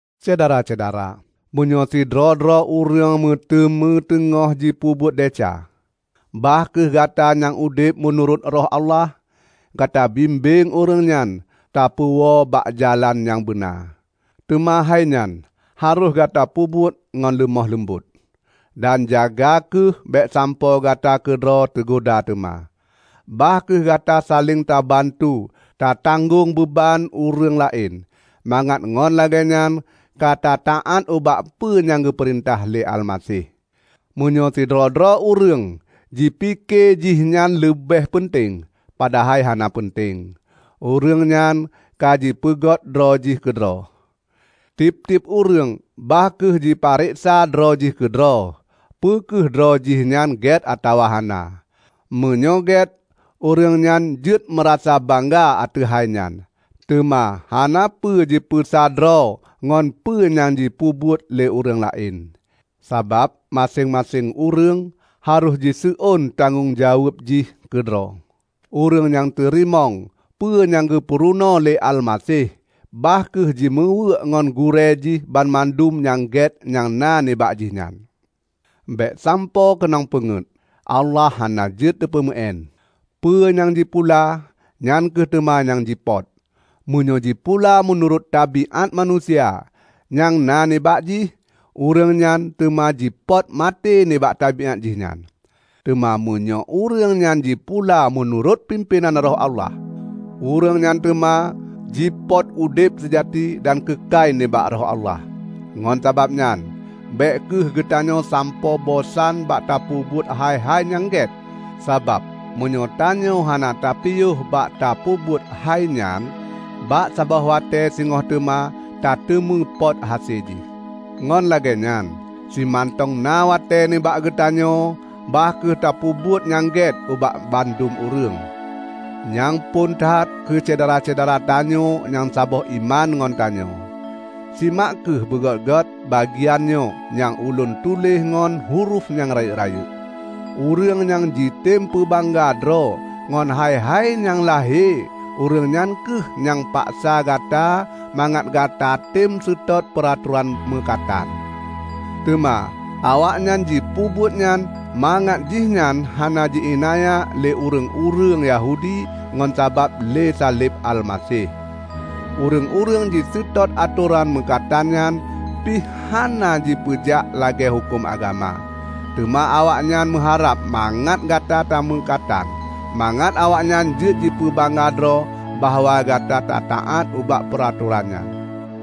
Syedara-syedara! Meunyoe sidroe-droe ureuëng meuteumé teungoh jipeubuet desya, bah kheueh gata nyang udeb meunurot Roh Allah, gata bimbeng ureuëng nyan tapeuwoe bak jalan nyang beuna. Teuma hai nyan harôh gata peubuet ngon leumoh leumbot, dan jaga kheueh bék sampoe gata keudroe teugoda teuma. Bah kheueh gata saléng tabantu tatanggong beuban ureuëng laén, mangat ngon lagée nyan ka tataát ubak peue nyang geupeurintah lé Almaseh. Meunyoe sidroe-droe ureuëng jipike jih nyan leubeh peunteng, padahai hana peunteng, ureuëng nyan ka jipeungeut droe jih keudroe. Tieb-tieb ureuëng bah kheueh jipeureksa droe jih keudroe peu kheueh droe jih nyan gét atawa hana. Meunyoe gét, ureuëng nyan jeuet meurasa bangga ateueh hai nyan. Teuma hanapeue jipeusa droe ngon peue nyang jipeubuet lé ureuëng laén. Sabab maséng-maséng ureuëng harôh jiseuôn tanggong jaweueb jih keudroe. Ureuëng nyang teurimong peue nyang geupeurunoe lé Almaseh, bah kheueh jimeuweuk ngon gurée jih banmandum nyang gét nyang na nibak jih nyan. Bék sampoe keunong peungeut. Allah hana jeuet teupeumeuén! Peue nyang jipula, nyan kheueh teuma nyang jipöt. Meunyoe jipula meunurot tabiát manusia nyang na nibak jih, ureuëng nyan teuma jipöt maté nibak tabiát jih nyan. Teuma meunyoe ureuëng nyan jipula meunurot pimpénan Roh Allah, ureuëng nyan teuma jipöt udeb seujati dan keukai nibak Roh Allah. Ngon sabab nyan, bék kheueh geutanyoe sampoe bosan bak tapeubuet hai-hai nyang gét; sabab meunyoe tanyoe hana tapiôh bak tapeubuet hai nyan bak saboh watée singoh teuma tateumé pöt hase jih. Ngon lagée nyan, simantong na watée nibak geutanyoe, bah kheueh tapeubuet nyang gét ubak mandum ureuëng, nyang phon that keu syedara-syedara tanyoe nyang saboh iman ngon tanyoe. Simak kheueh beugét-gét bagian nyoe nyang ulôn tuléh ngon hurof nyang rayeuk-rayeuk. Ureuëng nyang jitem peubangga droe ngon hai-hai nyang lahé, ureuëng nyan kheueh nyang paksa gata mangat gatatem seutôt peuratoran meukatan. Teuma awaknyan jipeubuet nyan mangat jihnyan hana ji iénanya lé ureuëng-ureuëng Yahudi ngon sabab lé saleb Almaseh. Ureuëng-ureuëng jiseutôt atoran meukatan nyan pih hana jipeujak lagée huköm agama. Teuma awaknyan meuharab mangat gata tameukatan, mangat awaknyan jeuet jipeubangga droe bahwa gata tataát ubak peuratoran nyan.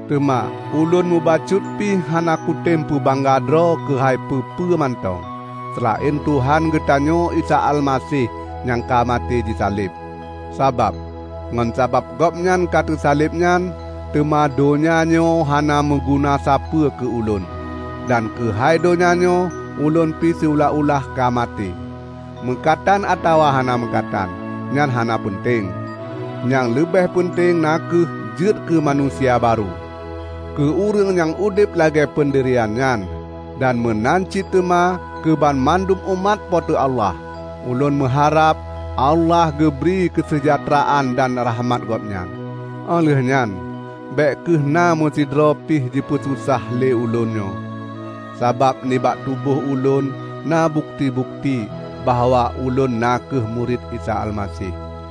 Teuma ulôn mubacut pi hana kutem peubangga droe keuhai peue-peue mantong, seulaén Tuhan geutanyoe Isa Almaseh nyang ka maté jisaleb. Sabab, ngon sabab Gobnyan ka teusaleb nyan, teuma donya nyoe hana meuguna sapeue keu ulôn. Dan keuhai donya nyoe, ulôn pi siulah-ulah ka maté. Meukatan atawa hana meukatan, nyan hana peunteng. Nyang leubeh peunteng na kheueh jeuet keumanusia barô. Keu ureuëng nyang udeb lagée peundirian nyan, dan meunan cit teuma keubanmandum umat Po teu Allah, ulôn meuharab Allah geubri keuseujahteuraan dan rahmat Gobnyan. Óh lheueh nyan, bék kheueh na meusidroe pih jipeususah le ulôn nyoe, sabab nibak tuboh ulôn na bukeuti-bukeuti bahwa ulôn na kheueh murit Isa Almaseh.